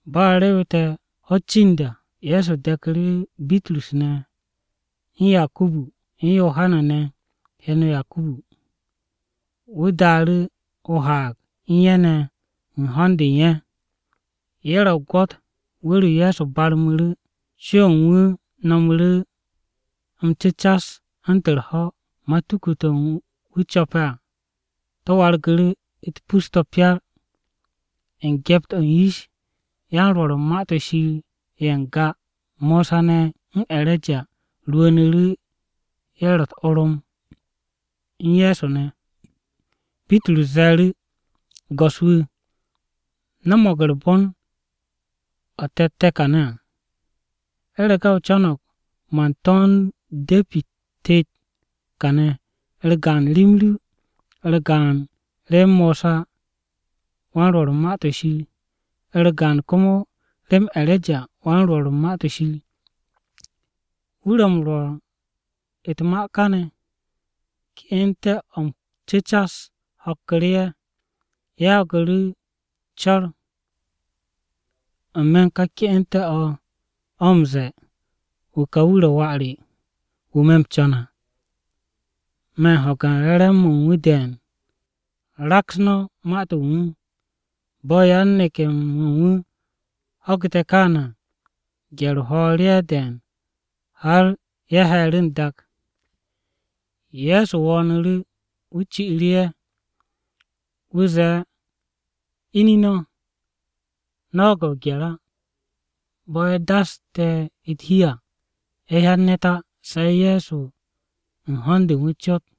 Bo̱ a rewete̱ ho̱-u̱t cind à, Ye̱so de̱ku̱ru̱ Bitrus ne̱, u̱n Yakubu, u̱n Yohana (heno Yakubu) ne̱, wu̱ daaru̱ o-haag u̱n ye̱ ne̱ u̱n ho̱n-de u̱n ye̱. Ye̱ ro̱ o-gwo̱t wu̱r-o Ye̱so barmu̱ru̱, co-o̱ u̱n wu̱ no̱mu̱ru̱ m-cu̱cas u̱ntu̱n u̱r-ho̱, matuku-to̱ wu̱ co̱pe̱ à to̱ wargu̱ru̱ u̱t-pus to̱ pyar. U̱n gyept-o̱ u̱n yish, yan-Rwo̱r u̱n Ma-to̱ Shir ye̱ n-ga, Mosa ne̱ u̱n E̱reja rwu̱u̱nu̱ru̱, ye̱ ro̱ u̱t-orom u̱n Ye̱so ne̱. Bitrus ze̱e̱ru̱ Ye̱so, “Go̱s-wu̱, nomog u̱r-bon o̱ te̱tte̱ kane̱ à! U̱rege̱ o co̱no̱g, man to̱nd de̱pi-u̱t tet kane̱, u̱r-gaan rem ru, u̱r-gaan rem Mosawan-Rwo̱r u̱n Ma-to̱ Shir, u̱r-gaan komo rem E̱rejawan-Rwo̱r u̱n Ma-to̱ Shir.” Wu̱ ro̱ m-rwo̱r u̱t-ma káane̱ ke'ente̱-o̱ m-cu̱cas ho̱kku̱ru̱ ye̱. Ye̱ ho̱gu̱ru̱ co̱r n-me̱ u̱n ká ke'ente̱-o̱ o̱ m-ze̱e̱, “Wu̱ ka wu̱ ro̱ Wà re, wu̱ me̱ m-co̱n à, me̱ m-ho̱ge̱ re̱re̱m-mo̱ u̱n wu̱ de̱e̱n. Raks no̱ ma-to̱ u̱n wu̱!” Bo̱ yan-neke̱-mo̱ u̱n wu̱ ho̱gu̱te̱ káane̱ à, gye̱r-o̱ ho̱o̱ru̱ ye̱ de̱e̱n, har ye̱ he̱e̱ru̱ n-dak. Ye̱so wo̱o̱nu̱ru̱, wu̱ ci'u̱ru̱ ye̱. Wu̱ zee, “Ine̱ no̱, no̱ ho̱ge̱ o-gye̱r á.” Bo̱ ye̱ daste̱ u̱t-hi à, ye̱ hyan ne̱t á se̱ Ye̱so u̱n ho̱n-de u̱n wu̱ cot.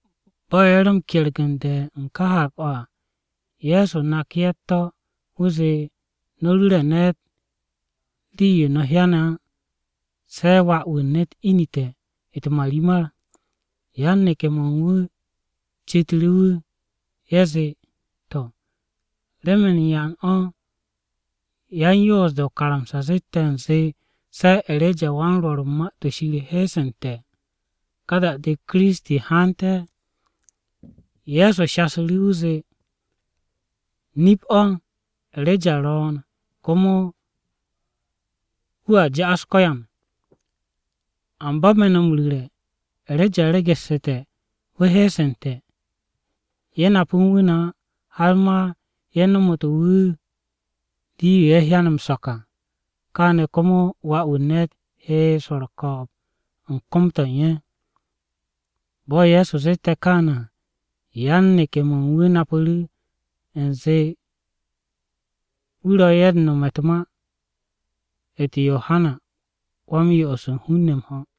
Bo̱ ye̱ ro̱ m-kergu̱nde̱ u̱n ká haag-o̱ à, Ye̱so naku̱ ye̱ u̱t-to̱. Wu̱ zee, “No̱ ru̱re̱ ne̱t rii-yo no̱ hyane̱ á, se̱ Wà-wu̱ u̱n ne̱t inu̱te̱ u̱t-marimar.” Yan-neke̱-mo̱ u̱n wu̱ citu̱ru̱ wu̱. Ye̱ zee, “To̱, ¿remen yan o̱ yan-Yoos-de o-karamsa zette̱ u̱nze, se̱ E̱rejawan-Rwo̱r u̱n Ma-to̱ Shir he'esente̱ ka da-de Kiristi haante̱?” Ye̱so shasu̱ru̱, wu̱ zee, “Nip-o̱, E̱reja ro̱o̱n, komo wu̱a ja'as ko̱yan. Amba me̱ no̱ m-ru̱re̱, E̱reja be'este̱ wu̱ he'esente̱, ye̱ nap u̱n wu̱ ne̱ á, har ma ye̱ nomotu̱ wu̱ rii-yo ye̱ hyane̱ m-so̱k à. Káane̱ komo Wà-wu̱ u̱n ne̱t he swo̱ u̱r-ko̱o̱b u̱n kom-to̱ u̱n ye̱.” Bo̱ Ye̱so zette̱ kaane̱ à, yan-neke̱-mo̱ u̱n wu̱ napu̱ru̱ u̱nze wu̱ ro̱ ye̱ u̱n nome̱ u̱n ma-u̱t Yohana Wa-m-Yo'os u̱n hun-ne̱ m-ho̱.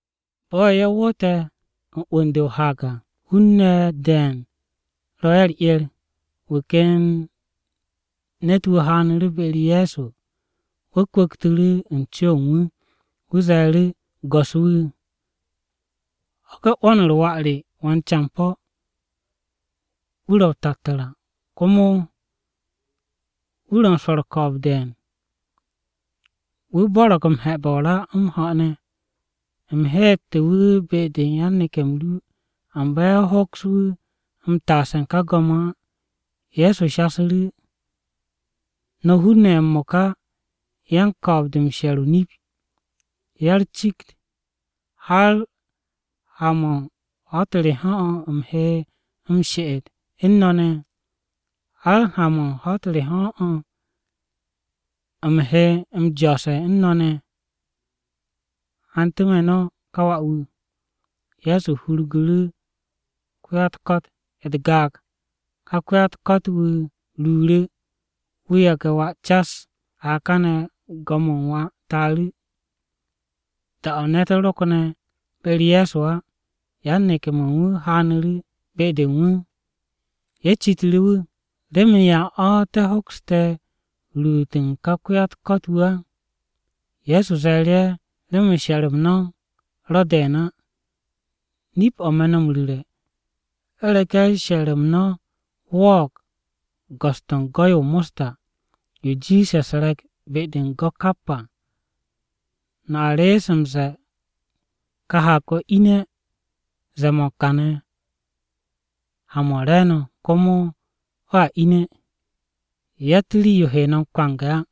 Bo̱ ye̱ woote̱ u̱n 'wu̱n-de o-haag à, hun-ne̱ de̱e̱n ro̱ ye̱ u̱r-'er. Wu̱ ken ne̱t-wu̱ haanu̱ru̱ be-u̱r Ye̱so, wu̱ kwu̱ktu̱ru̱ u̱n co-o̱ u̱n wu̱. Wu̱ ze̱e̱ru̱, “Go̱s-wu̱, ho̱ge̱ 'wo̱n-u̱r wà re wan-campo̱, wu̱ ro̱ o-tattu̱ra ne̱. Komo wu̱ ro̱ u̱n swo̱ u̱r-ko̱o̱b de̱e̱n. Wu̱ m-bo̱r m-he̱be̱ o-ra, m-ho̱ ne̱. U̱m heete̱ wu̱ be-de yan-neke̱-m ru, amba ye̱ hoks wu̱ m-taase̱ u̱n go̱m á.” Ye̱so shasu̱ru̱, “No̱ hun-ne̱ ye̱ m-mo̱ka, yan-ko̱o̱b-de m-she̱r o-nip, ya-u̱r-cikt, ¿har ha-mo̱ u̱n ho̱-u̱t re o̱ u̱m he m-she'et u̱n no̱ ne̱? ¿Har ha-mo̱ u̱n ho̱-u̱t re o̱ u̱m he m-jo̱o̱se̱ u̱n no̱ ne̱? Hantu̱ me̱ no̱ ka wà-wu̱.” Ye̱so hurgu̱ru̱ ko-ya-u̱t-ko̱t u̱t-gaag. Ká ko-ya-u̱t-ko̱t-wu̱ ruuru̱, wu̱ yage̱ wà cas. A kane̱ go̱m-o̱ u̱n wà taaru̱. Da-o̱ ne̱t ro̱kne̱ be-u̱r Ye̱so á, yan-neke̱-mo̱ u̱n wu̱ haanu̱ru̱ be-de u̱n wu̱. Ye̱ citu̱ru̱ wu̱, “¿Remen yan o̱ te̱ hokste̱ ruut u̱n ká ko-ya-u̱t-ko̱t-wu̱ á?” Ye̱so ze̱e̱ru̱ ye̱, “Remen she̱r-m no̱ ro̱ de̱e̱n á. Nip-o̱ me̱ no̱ m-ru̱re̱, u̱rege̱ she̱r-m no̱ wo̱o̱g go̱s-to̱ u̱n go'-yo o-mosta yo jiishe̱ u̱s-re̱k be-de u̱n go̱ kap à, no̱a rees m-ze̱e̱ ka haag-o̱ ine̱ zee-mo̱ u̱n kane̱ ha-mo̱ u̱n re̱e̱no̱, komo o̱a ine̱. Yatt rii-yo he no̱ m-kwange̱ á.”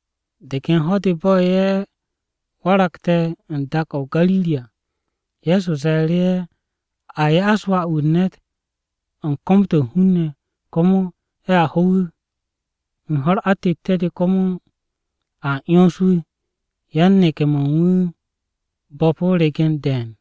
De ken ho̱-de bo̱ ye̱ waragte̱ u̱n dak-o̱ o-Gariri à, Ye̱so ze̱e̱ru̱ ye̱, “A ya'as Wà-wu̱ u̱n ne̱t u̱n kom-to̱ u̱n hun-ne̱. Komo ye̱a ho wu̱, u̱n ho̱-u̱r atette̱-de komo a 'yons wu̱.” Yan-neke̱-mo̱ u̱n wu̱ bo̱pu̱ o-regen de̱e̱n.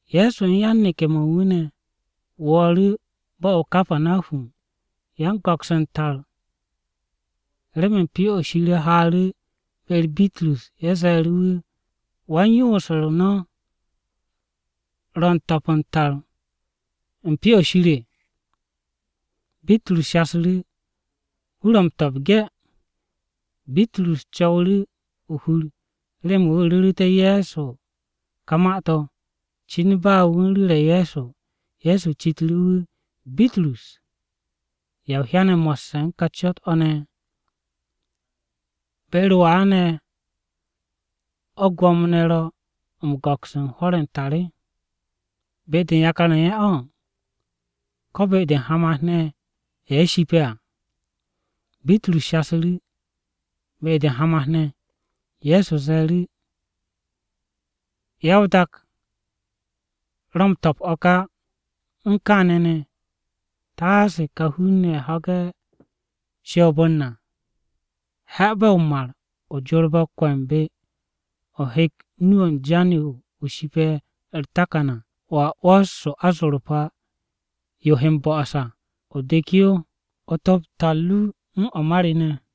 Ye̱so u̱n yan-neke̱-mo̱ u̱n wu̱ ne̱ wo̱o̱ru̱ bo̱-o̱ o-Kapanahum. Yan-go̱ks u̱n tar remen Pyo-o̱ Shir haaru̱ be-u̱r Bitrus, ye̱ ze̱e̱ru̱ wu̱, “¿Wan-yoos-u̱r no̱ ro̱ u̱n to̱p u̱n tar-o̱ u̱n Pyo-o̱ Shir?” Bitrus shasu̱ru̱, “Wu̱ ro̱ m-to̱p ge̱.” Bitrus co̱wu̱ru̱ o-hur remen wu̱ ru̱ru̱té̱ Ye̱so ka ma-to̱. Cin ba wu̱ u̱n ru̱re̱ Ye̱so, Ye̱so citu̱ru̱ wu̱, “Bitrus ¿Ya o hyane̱ mo̱sse̱ u̱n ká cot-o̱ ne̱? ¿Be-u̱r wan-ne̱ o̱ gwo̱mo-ne̱ ro̱ m-go̱ks u̱n hwo̱r-ye̱ u̱n tar o̱, be-de u̱n yakar-ye̱ u̱n ye̱ o̱, ko̱ be-de u̱n hamat-ne̱ ye̱ ye̱ shipe̱ à?” Bitrus shasu̱ru̱, “Be-de u̱n hamat-ne̱.” Ye̱so ze̱e̱ru̱, “Ya-o-dak ro̱ m-to̱p o̱ ka á! Kap u̱n kaane̱ ne̱, taase ká hun-ne̱ ho̱ge̱ shoob-u̱r na, he̱be̱ o-mar o jorbe̱ o-kwe̱mbe̱, o hek nu-o̱ u̱n jan-yo o shipe̱ u̱r-takan à. Wo̱a 'wo̱s o-azorpa yo he m-bo'os à, o dek yo o to̱p tar ru u̱n o̱ ma re ne̱.”